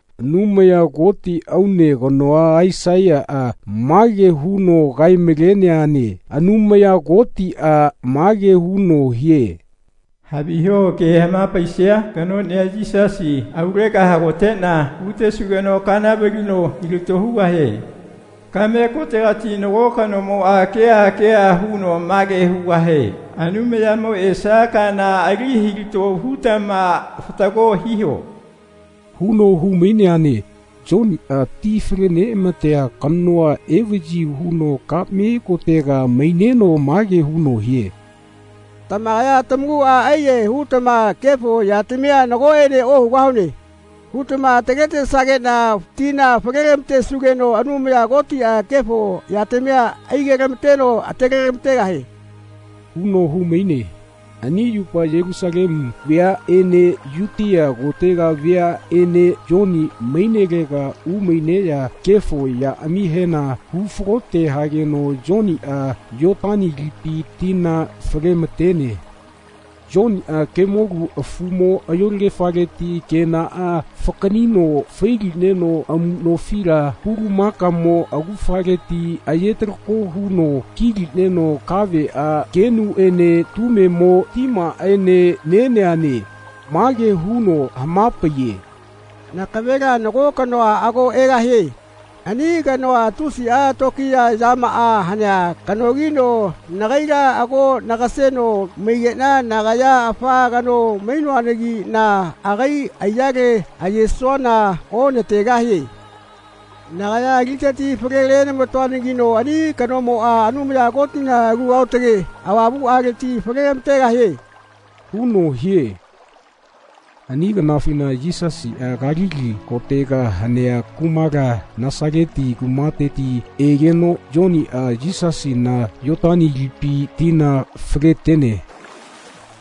Anumaya Koti aune kanoa Aisaiyaꞌa mage huno kaemaleneane Anumaya Kotiꞌa mage huno hie “Haviho ke hamapaisia kanoꞌnia Yisasi aulega hagoteꞌna hutesugeno kana valino hilato hugahie. Kaꞌme kotegati nago kanomoꞌa keha keha huno mage hugahie “Anumayamo esia kana ali hilato hutama fatago hiho.” huno humaineane. Yoniꞌa ti faleneꞌamatea kanoa evaꞌyi huno kaꞌme kotega maineno mage huno hie “Tamakaya tamakuꞌa aiyahae hutama kefo yatamia ‘Nagoꞌene ohugahune.’ hutama ataletesageꞌna tina falelamatesugeno Anumaya Kotiꞌa kefo yatamia aigetamateno atalelamategahie.” huno humaine. Ani yupa Yelusalemu veaꞌene Yutia kotega veaꞌene Yoni mainelega umaineꞌya kefo yaꞌamihena hufalote hageno Yoniꞌa Yotani lipi tina falematene. Yoniꞌa kemolu afumo ayolagefaleti kenaꞌa fakaꞌnino failineno amuꞌnofila pulamakamo augafaleti ayetalako huno kilineno kaveꞌa kenuꞌene tumemo timaꞌaene neneane. Mage huno hamapaiye “Nakavela nago kanoa ago egahie. Ani kanoa tusiꞌa tokiya yamaꞌa hanea kanogino nagaila ago nagaseno maigeꞌna nagaya afa kano mainoanagiꞌna agai aiyale ayesuana onategahie. Nagaya titeti falenelamatoanagino ani kanomoꞌa Anumaya Kotina Alu Aotage Avamuꞌaleti falelamategahie.” huno hie. Ani kanafina Yisasiꞌa Kalili kotega hanea kumala Nasaleti kumateti egeno Yoniꞌa Yisasina Yotani lipi tina faletene.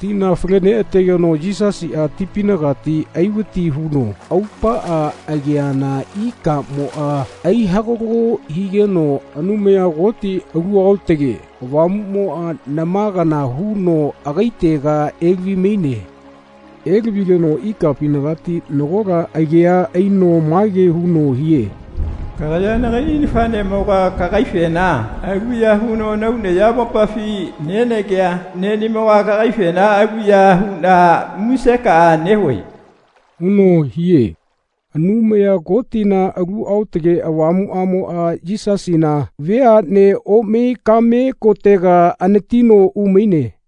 Tina faleneꞌategeno Yisasiꞌa tipinagati aivati huno aupaꞌa ageana ikamoꞌa aihagalo higeno Anumaya Koti Alu Aotage Avamuꞌmoꞌa nama kana huno agaitega elavimaine. Elavigeno ikapinagati nagola agea aino mage huno hie “Kagaya nagaiꞌni nafaꞌnemoga kagaifena aluya huno nahau nayamopafi nenagea neꞌnimoga kagaifena aluya huꞌna musekaꞌa nehue.” huno hie. Anumaya Kotina Alu Aotage Avamuꞌamoꞌa Yisasina veaꞌne omai kaꞌme kotega anatino umaine.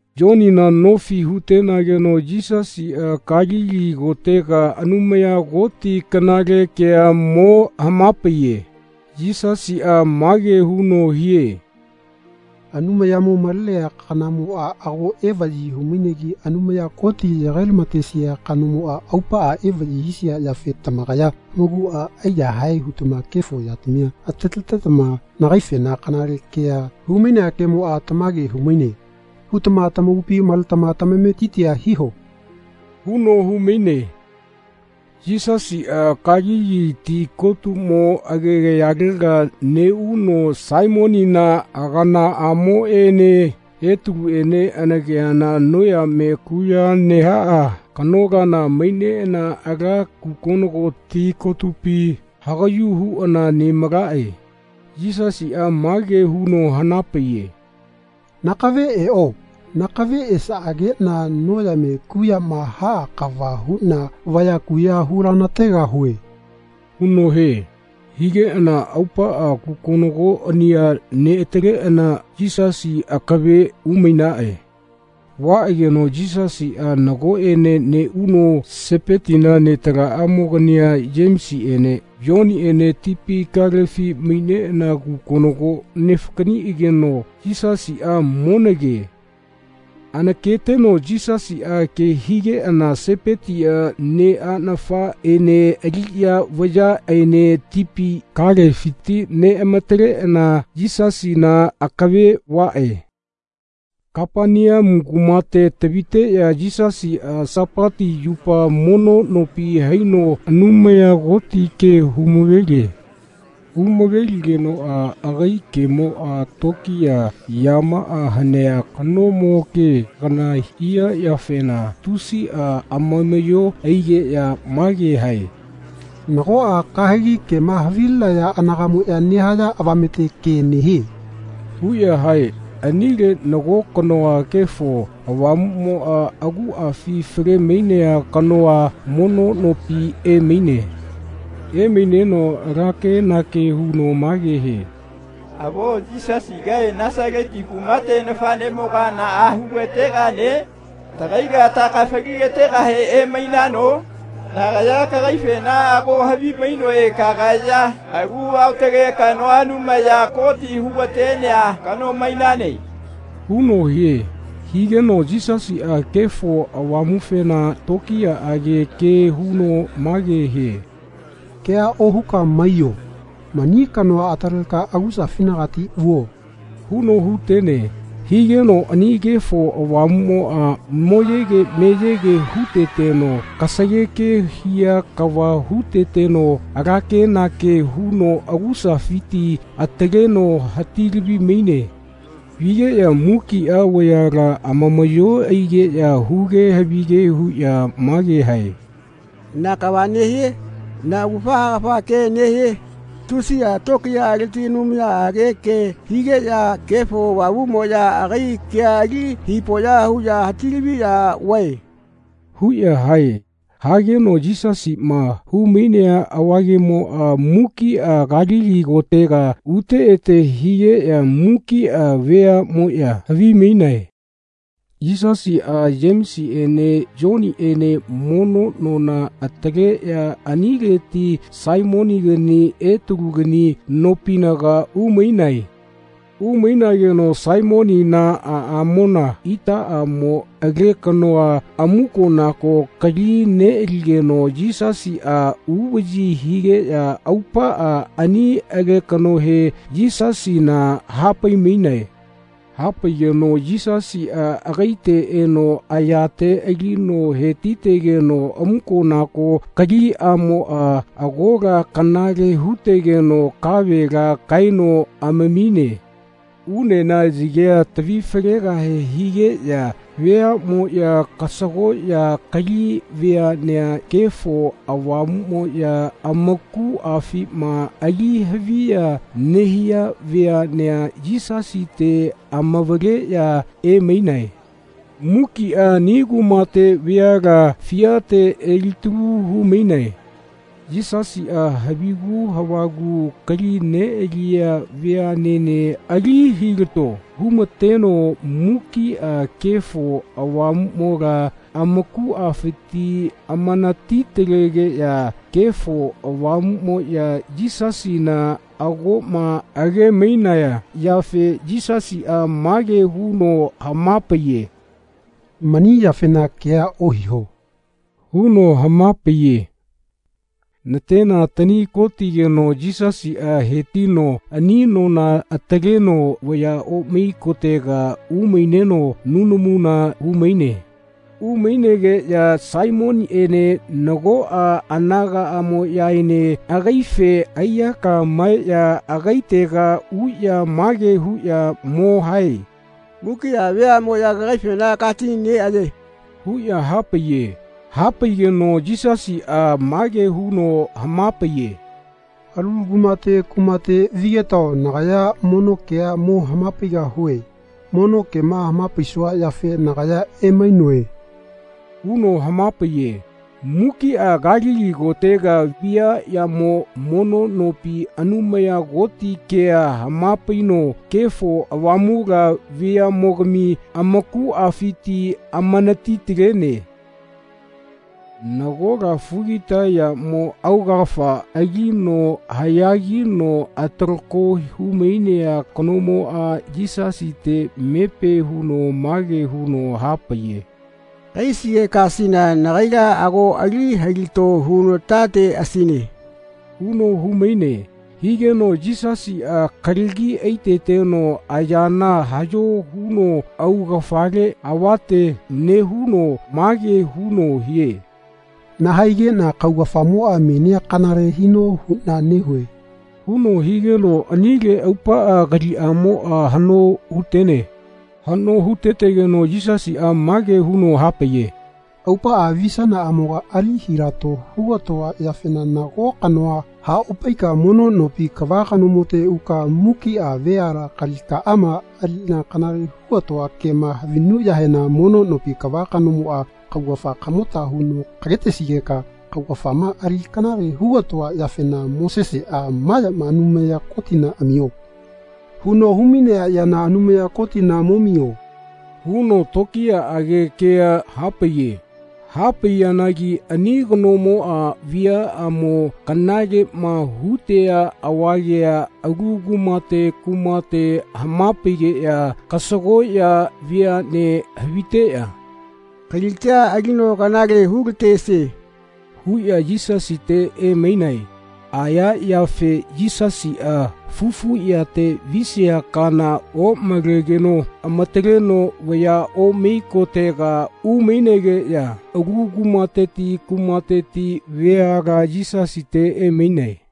Yonina nofi hutenageno Yisasiꞌa Kalili kotega Anumaya Koti kanale kea mo hamapaiye. Yisasiꞌa mage huno hie “Anumayamo malenea kanamoꞌa ago evaꞌyi humainegi Anumaya Koti yagailamatesia kanamoꞌa aupaꞌa evaꞌyi hisia yafe tamakaya tamakuꞌa aiyahae hutama kefo yatamia ataletetama nagaifena kanale kea humainea kemoꞌa ‘Tamage humaine.’ hutama tamakupi maletama tamametitia hiho.” huno humaine. Yisasiꞌa Kalili ti kotumo agegayalega neꞌuno Saimonina aganaꞌamoꞌene Etaluꞌene anakeana noyame kuꞌya nehaꞌa kanolana maineꞌana ala kukonogo ti kotupi hagaꞌyu huꞌana nemalaꞌe. Yisasiꞌa mage huno hanapaiye “Nakave eꞌo. Nakave esaꞌageꞌna noyame kuꞌyama haꞌa kava huꞌna vaya kuꞌya hulanategahue.” huno hie. Higeꞌana aupaꞌa kukonogoꞌania neꞌataleꞌana Yisasi akave umainaꞌe. Vaꞌageno Yisasiꞌa nagoꞌene neꞌuno Sepetina netalamaꞌamogania Yemesiꞌene Yoniꞌene tipi kalefi maineꞌana kukonogo nefakaꞌniꞌageno Yisasiꞌa monake. Anaketeno Yisasiꞌa ke higeꞌana Sepetia neꞌanafaꞌene aliꞌya vayaꞌaene tipi kalefiti neꞌamataleꞌana Yisasina akave vaꞌe. Kapaneamu kumate taviteꞌya Yisasiꞌa Sapati yupa mono nopi haino Anumaya Koti ke humavelie. Humaveligenoꞌa agai kemoꞌa toꞌkiya yamaꞌa hanea kanomo ke kana hia yafena tusiꞌa amamaꞌyo aigeꞌya mage hae “Nagoꞌa kahegi kema havilinaya anagaꞌmoꞌya nehaya avamete ke nehie.” huꞌya hae. Anile nago kanoa Kefo Avamuꞌmoꞌa aguꞌafi falemainea kanoa mono nopi emaine. Emaineno ala kenake huno mage hie “Avo Yisasigae Nasaleti kumate nafaꞌnemoga naꞌa hulategane? Tagaila tahaeka falilategahe emainano? Nagaya kagaifena ago havimainoe kagaya alu aotage kanoa Anumaya Koti hugatenea kano mainane.” huno hie. Higeno Yisasiꞌa Kefo Avamufena tokiyaꞌage ke huno mage hie “Kea ohuka maiyo. Mani kanoa ataleka agusafinagati vuo.” huno hutene. Higeno ani Kefo Avamuꞌmoꞌa moyege meyege huteteno kasageke hia kava huteteno alakenake huno agusafiti ataleno hatilavimaine. Vigeꞌya mukiꞌa vayala amamaꞌyo aigeꞌya huge havige huꞌya mage hae “Na kava nehie? Na augafa haekafa ke nehie? Tusiꞌa toꞌkiyaleti anumayaꞌage ke higeꞌya Kefo Avamuꞌmoꞌya agai kea ali hipoꞌya huꞌya hatilaviꞌya vae.” huꞌya hae. Hageno Yisasiꞌma humainea avagemoꞌa mukiꞌa Kalili kotega ute ete higeꞌya mukiꞌa veaꞌmoꞌya havimainae. Yisasiꞌa Yemesiꞌene Yoniꞌene mono nona ataleꞌya anileti Saimonigani Etalugani nopinaga umainae. Umainageno Saimonina aꞌamona itaꞌamo alekanoa amukonako kali neꞌaligeno Yisasiꞌa uvaꞌyi higeꞌya aupaꞌa ani alekanohe Yisasina hapaimainae. Hapaigeno Yisasiꞌa agaite eno ayate alino hetitegeno amukonako kaliꞌamoꞌa agola kanale hutegeno kavela kaeno amamine. Unena yagea tavifalegahe higeꞌya veaꞌmoꞌya kasagoꞌya kali veaꞌnea Kefo Avamuꞌmoꞌya amakuꞌafima ali haviya nehia veaꞌnea Yisasite amavaleꞌya emainae. Mukiꞌa ani kumate veala fiate elitalu humainae. Yisasiꞌa havigu havagu kali neꞌaliya veaꞌnene ali hilato humateno mukiꞌa Kefo Avamuꞌmola amakuꞌafiti amanatitalegeꞌya Kefo Avamuꞌmoꞌya Yisasina agoꞌma agemainaya yafe Yisasiꞌa mage huno hamapaiye “Mani yafena kea ohiho.” huno hamapaiye. Natena tani kotigeno Yisasiꞌa hetino ani nona ataleno vaya omai kotega umaineno nunamuna humaine. Umainegeꞌya Saimoniꞌene nagoꞌa anagaꞌamoꞌyaene agaife aiyaka maeꞌya agaitega uꞌya mage huꞌya mo hae “Mukiꞌa veaꞌmoꞌya kagaifena katineꞌayae.” huꞌya hapaiye. Hapaigeno Yisasiꞌa mage huno hamapaiye. “Alu kumate kumate vigetao nagaya mono kea mo hamapaigahue. Mono kema hamapaisua yafe nagaya emainoe.” huno hamapaiye. Mukiꞌa Kalili kotega viaꞌyamo mono nopi Anumaya Koti kea hamapaino Kefo Avamula veaꞌmogami amakuꞌafiti amanatitalene. Nagola fugitayamo augafa alino haꞌyagino atalako humainea kanomoꞌa Yisasite mepe huno mage huno hapaiye “Kahaisigekasina nagaila ago ali hilato hunatateꞌasine.” huno humaine. Higeno Yisasiꞌa kalagi aiteteno ayana haꞌyo huno augafale avate nehuno mage huno hie “Nahaigeꞌna kaugafamoꞌa menia kanale hino huꞌna nehue.” huno higeno anile aupaꞌa kaliꞌamoꞌa haꞌno hutene. Haꞌno hutetegeno Yisasiꞌa mage huno hapaiye “Aupaꞌa visanaꞌamoga ali hilato hugatoa yafena nago kanoa haꞌopaika mono nopi kava kanomote uka mukiꞌa veala kalikaꞌama aliꞌna kanale hugatoa kema havinuꞌyahena mono nopi kava kanomoꞌa kaugafa kamota huno kagetesigeka kaugafama ali kanale hugatoa yafena Moseseꞌa ‘Ma yama Anumaya Kotina amio.’ huno humainea yana Anumaya Kotina momio.” huno toꞌkiyaꞌage ke hapaiye. Hapaiyanagi ani kanomoꞌa viaꞌamo kanaleꞌma hutea avagea alu kumate kumate hamapaigeꞌya kasagoꞌya veaꞌne haviteꞌya “Kalitia alino kanale hulatesie.” huꞌya Yisasite emainae. Aya yafe Yisasiꞌa fufuꞌyate visia kana omalegeno amataleno vaya omai kotega umainegeꞌya alu kumateti kumateti veala Yisasite emainae.